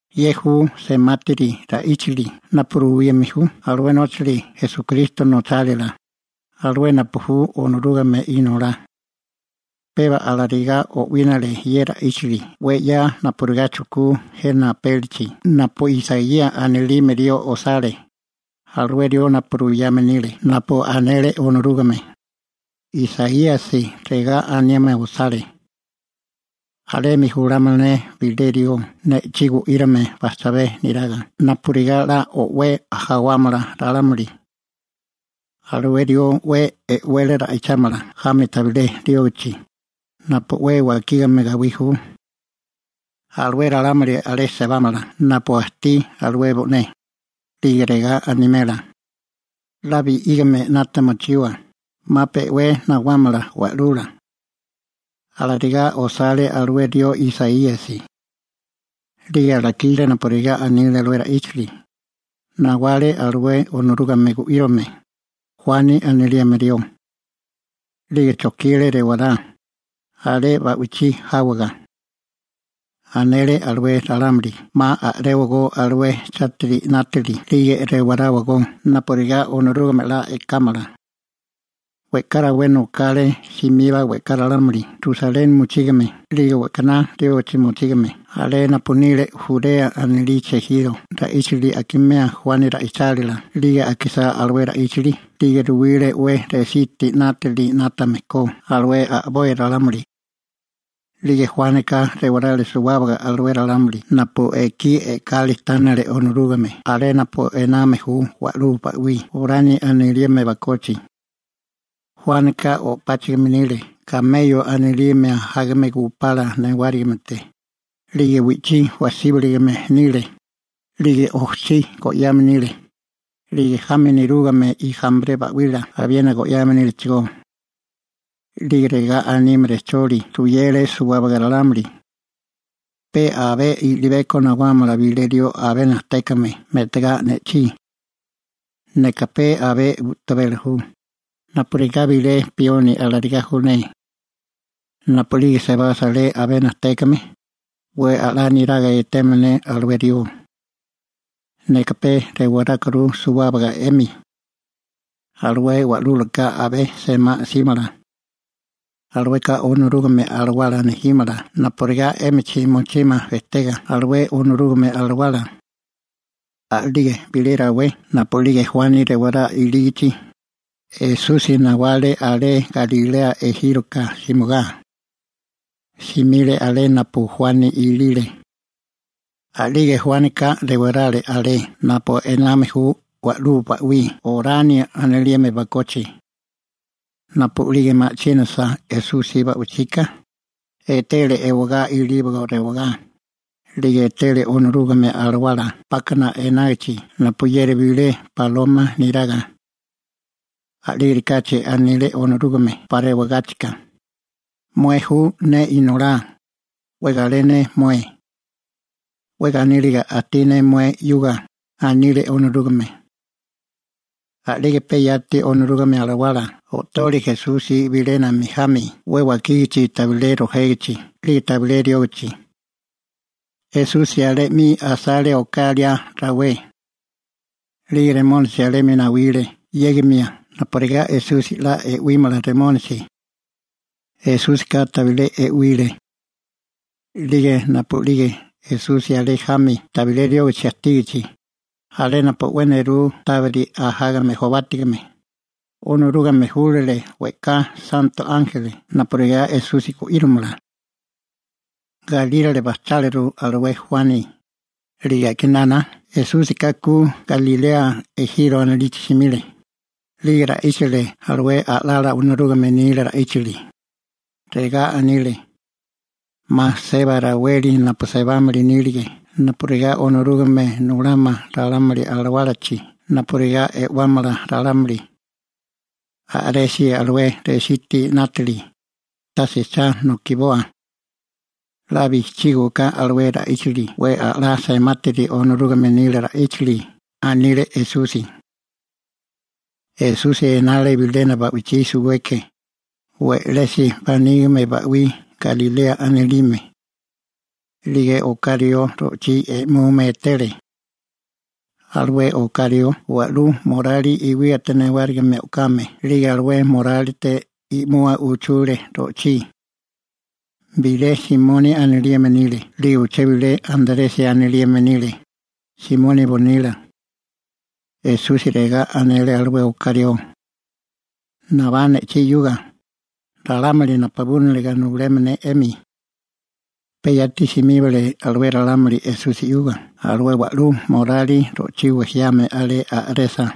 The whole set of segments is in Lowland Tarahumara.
Ye ju semátiri ra'íchali napu ruwime ju alué nóchali Esukristo nochálila, alué napu ju Onorúgame Inolá. Peba alarigá o'wínale ye ra'íchili 'we 'ya napurigá chujkú jena apélichi napu Isaíasi anilime rió osale, alué rió napu ruyame nile napu anele Onorúgame. Isaíasi regá anime osale: Alemi julámala ne bilé rió ne'chí gu'írame bajchabé neraga napurigá 'la o'wé jawámala ralámuli. Alué rió 'we e'wele ra'ichámala jami tabilé riógichi, napu 'we wakígame gawí ju. Alué ralámuli alé sebámala napu ajtí alué bo'né, 'lige regá animela: «'La bi'ígame 'nata mochiwa, 'ma pe 'we nawámala Wa'lula.» Alarigá osale alué rió Isaíasi. 'Lige alakile napurigá anile ye ra'íchili, nawale alué Onorúgame gu'írome, Juani anilime rió. 'Lige chojkile rewará, alé ba'wichí jáwaga. Anele alué ralámuli 'ma a'réwagó alué chátiri 'nátili 'lige rewaráwagó napurigá Onorúgame 'la e'kámala. We'ká rawé nokale simiba we'ká ralámuli Rusaleni mochígame 'lige we'kaná riógichi mochígame alé napu nile Jurea anilichi ejiro ra'íchili akimea Juani ra'ichálila 'lige akisá alué ra'íchili 'lige ruwile 'we resítiri 'nátili 'nátame ko alué a'boi ralámuli. 'Lige Juánika rewarale suwábaga alué ralámuli napu ekí e'kali tánele Onorúgame alé napu ename ju wa'lú ba'wí Jorani anilime bakochi. Juánika o'páchigime nile kameyo anilime ajágame gupala newárigimete, 'lige wi'chí wajsíbalagame nile, 'lige ojchí go'yame nile, 'lige jami nerúgame ijampre ba'wila abiena go'yame nílechigó. 'Lige regá anime rejcholi ruyele suwábaga ralámuli: ―Pe abé i'libeko nawámala bilé rió abé najtékame me'tagá ne'chí. Neka pe abé u'tabela ju, napurigá bilé pioni alarigá ju ne. Napu'lige sebasa alué abé najtékame, 'we a'lá niraga etémala ne alué rió. Neka pe rewarákuru suwábaga 'emi. Alué wa'lúlaka abé semá 'símala. Alueka Onorúgame Alawala nejímala napurigá 'émichi mochímala bejtega alué Onorúgame Alawala. A'lige bilé rawé napu'lige Juani rewará ilígichi, Esusi nawale alé Galilea ejíroka simigá. Simile alé napu Juani ilile. A'lige Juánika rewarale alé napu ename ju wa'lú ba'wí Jorani anilime bakochi. Napu'lige ma'chínasa Esusi ba'wichika, etele ewagá ilíbago rewagá, 'lige etele Onorúgame Alawala 'pákana enágichi napuyeri bilé baloma neraga. A'lígerikáchi anile Onorúgame 'pa rewagáchika: ―Mué ju ne Inolá. 'We galé ne mué. 'We ganíliga ajtí ne mué 'yuga ―anile Onorúgame. A'lige pe yati Onorúgame Alawala o'tole Esusi bilénami jami 'we wakígichi tabilé rojégichi 'lige tabilé riógichi. Esusi alé 'mi asale oká liá rawé. 'Lige Satanasi (Remónisi) alemi nawile 'yégimia napurigá Esusi 'la e'wímala Satanasi. Esúsika tabilé e'wile. A'lige napu'lige Esusi alé jami tabilé riógichi ajtígichi, alé napu 'we nerú tábiri ajágame jobátigame, Onorúgame júlale we'ká santo ánjeli napurigá Esusi gu'íromala. Galírale bajcháliru alué Juani, 'lige a'kinana Esúsika ku Galilea ejiro anilichi simile, 'lige ra'íchale alué a'lala Onorúgame nila ra'íchali. Regá anile: ―'Ma seba raweli napu sebámili nílige napurigá Onorúgame nulámala ralámuli alawálachi napurigá e'wámala ralámuli. A'resi alué resítiri 'nátili, tase cha nokiboa. 'La bijchígiwaká alué ra'íchili 'we a'lá semátiri Onorúgame nila ra'íchili ―anile Esusi. Esusi enale bilena ba'wichí suweke, we'lesi manígime ba'wí Galilea anilime. 'Lige oká rió ro'chí e'mume etele. Alué oká rió wa'lú morali iwíate newárigime o'kame, 'lige alué morálite i'mua uchule ro'chí. Bilé Simoni anilime nile 'lige uché bilé Antresi anilime nile, Simoni bonila. Esusi regá anele alué oká rió: ―Nabá ne'chí 'yuga, ralámuli napabúniliga nulémala ne 'emi. Pe yati simíbale alué ralámuli Esusi 'yuga alué wa'lú morali ro'chí wejiame alé a'resa.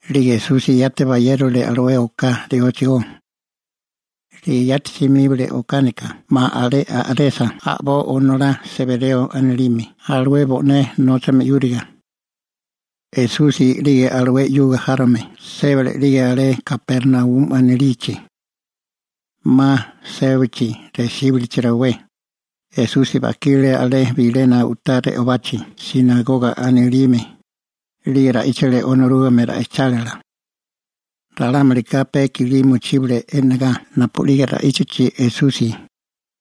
'Lige Esusi yati bayérole alué oká rióchigó. 'Lige yati simíbale okánika 'ma alé a'resa a'boi onolá Sebereo anilime alué bo'né nóchame 'yúriga. Esusi 'lige alué 'yuga járome sébale 'lige alé Kapernaumi anilichi. 'Ma sébachi resíbulichi rawé, Esusi bajkile alé bilena u'tá re'obachi «sinagoga» anilime, 'lige ra'íchale Onorúgame ra'ichálila. Ralámulika pe i'kilí mochíbale e'negá napu'lige ra'íchachi Esusi,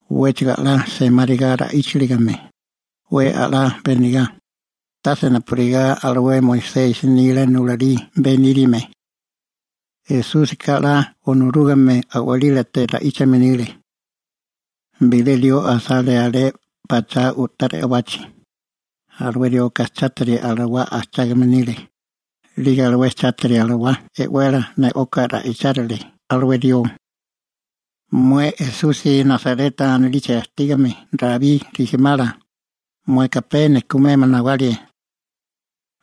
'wéchigo 'la semáriga ra'íchaligame, 'we a'lá benegá, tase napurigá alué Moisesi nila nulalí beníriame. Esúsika 'la Onorúgame a'walílate ra'íchame nile. Bilé rió asale alé pachá u'tá re'obachi, alué rioka chátiri alawá ajchágame nile, 'lige alué chatiri alawá e'wele ne'oka ra'ichárile alué rió: ―Mué Esusi Nasareta anilichi ajtígame Rabí rijimala, mueka pe nejkumemia nawale.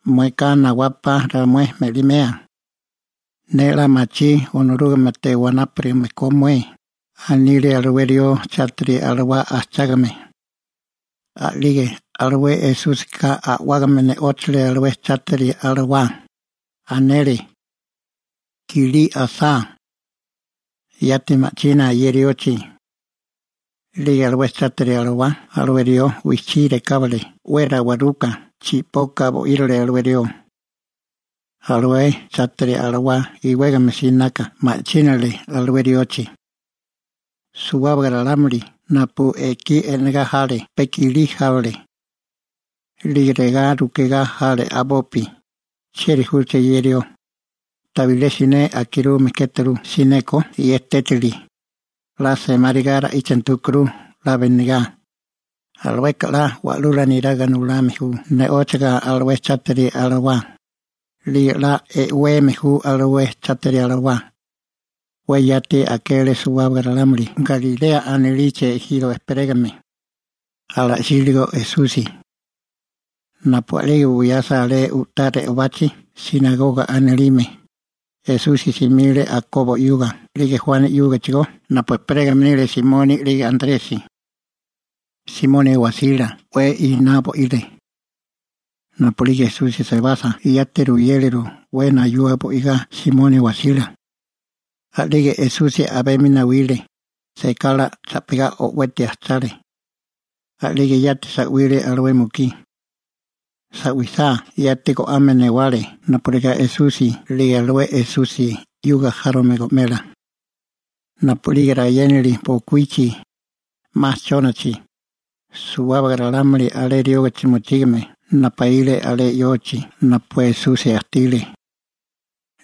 ¿Mueka nawapa ramué me'limea? Ne 'la machí Onorúgamete wanápurigame ko mué ―anile alué rió chátiri alawá ajchágame. A'lige alué Esúsika a'wágame ne'óchale alué chátiri alawá, anele: ―¡Kilí asá! ¡Yati ma'china ye riochi! A'lige alué chátiri alawá alué rió wijchí rekábale 'we rawaruka chi'poka bo'írale alué rió. Alué chátiri alawá iwégame sinaka ma'chínale alé riochi. Suwábaga ralámuli napu ekí e'negá jale pe i'kilí jábale. 'Lige regá rukegá jale a'bopi: ―¿Chieri júché ye rió? Tabilé siné akirume kéturu sineko ye tétili. 'La semáriga ra'íchanti júkuru 'la benegá. Alueka 'la wa'lula neraga nulame ju ne'óchiga alué chátiri alawá, 'lige 'la e'weme ju alué chátiri alawá. 'We yati akele suwábaga ralámuli Galilea anilichi ejiro ejperégame, ala'síligo Esusi. Napu a'lige buyasa alé u'tá re'obachi «sinagoga» anilime, Esusi simile Akobo 'yuga 'lige Juani 'yúgachigó napu ejperégame nile Simoni 'lige Antresi. Simoni wasila 'we iná bo'ile. Napu'lige Esusi sebasa yati ruyéleru 'we nayua bo'igá Simoni wasila. A'lige Esusi a'bemi nawile, sekala cha'pigá o'weti ajchale. A'lige yati sa'wile alué mukí. Sa'wisá yati go'ame newale napurigá Esusi 'lige alué Esusi 'yuga járome go'mela. Napu'lige rayénali bokuíchi, 'ma chónachi, suwábaga ralámuli alé riógichi mochígame napaíle alé yochi napu Esusi ajtile.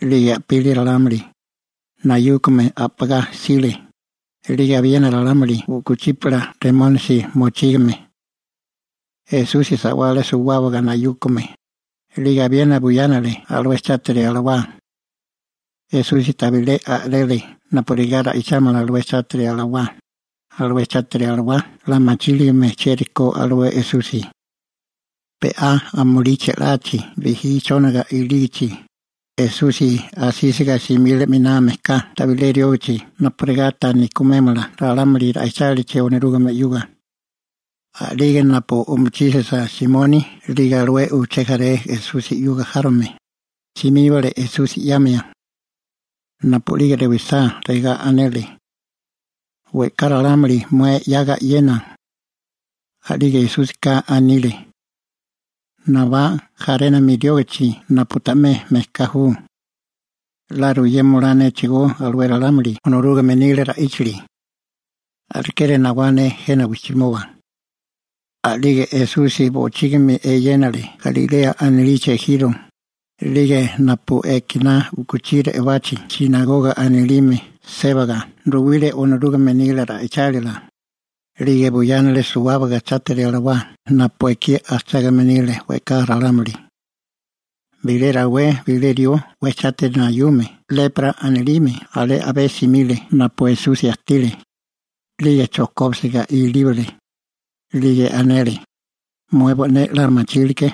'Lige a'pili ralámuli, nayúkame a'pagá jsile, 'lige abiena ralámuli u'kuchípala remónisi mochígame. Esusi sa'wale suwábaga nayúkome, 'lige abiena buyánale alué chátiri alawá. Esusi tabilé a'rele napurigá ra'ichámala alué chátiri alawá, alué chátiri alawá 'la machíligame chieri ko alué Esusi. Be'á amulí che'lachi, bijí chóniga ilígichi, Esusi asísiga simile 'miná mejká tabilé riógichi napurigá ta nejkumémala ralámuli ra'ichálichi Onorúgame 'yuga. A'lige napu o'mochísisa Simoni 'lige alué uché jaré Esusi 'yuga járome, simíbale Esusi 'yamia. Napu'lige rewisá, regá anele: ―We'ká ralámuli mué 'yaga e'yena. A'lige Esúsika anile: ―Nabá jarénami riógichi napu ta'mé mejká ju. 'La ruyema olá néchigó alué ralámuli Onorúgame nila ra'íchili. Alekeri nawá ne jena wijchimoba. A'lige Esusi bochígimi eyénale Galilea anilichi ejiro, 'lige napu ekiná u'kuchí re'obachi «sinagoga» anilime sébaga ruwile Onorúgame nila ra'ichálila, 'lige buyánale suwábaga chátiri alawá napu ekí ajchágame nile we'ká ralámuli. Bilé rawé bilé rió 'we chátiri nayume «lepra» anilime, alé a'bé simile napu Esusi ajtile, 'lige chojkóbisiga ilíbale, 'lige anele: ―Mué bo'né 'la machílike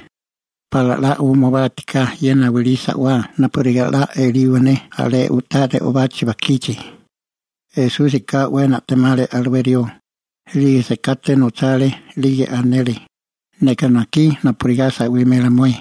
pala 'la umubátiká ye nawilí sa'wá napurigá 'la eliwa ne alé u'tá re'obachi bajkichi. Esúsika 'we na'temale alué rió, 'lige sekate nochale 'lige anele: ―Neka najkí napurigá sa'wimela mué.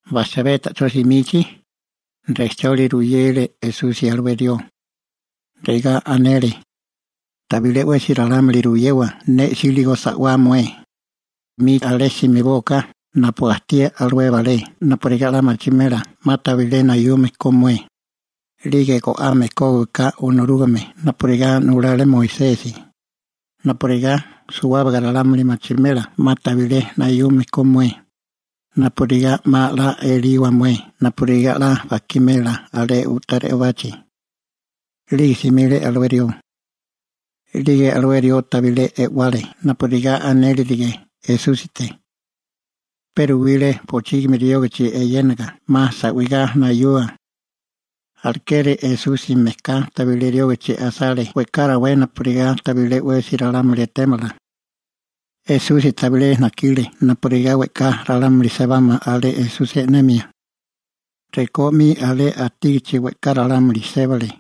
Bajchabé ta'chó simichi, rejcholi ruyele Esusi alué rió, regá anele: ―Tabilé 'wesi ralámuli ruyewa ne 'síligo sa'wá mué. 'Mi alé simibóaká napu ajtí alué balé napurigá 'la machimela 'ma tabilé nayume ko mué, 'lige go'ame kógiwaká Onorúgame napurigá nulale Moisesi, napurigá suwábaga ralámuli machimela 'ma tabilé nayume ko mué, napurigá 'ma 'la eliwa mué napurigá 'la bajkimela alé u'tá re'obachi. 'Lige simile alué rió. 'Lige alué rió tabilé e'wale napurigá anélirige Esúsite. Pe ruwile bochígimi riógichi eyénaga 'ma sa'wigá nayua. Alekeri Esusi mejká tabilé riógichi asale we'ká rawé napurigá tabilé 'wesi ralámuli etémala. Esusi tabilé najkile napurigá we'ká ralámuli sebámala alé Esusi e'nemia. Rekó 'mi alé ajtígichi, we'ká ralámuli sébale.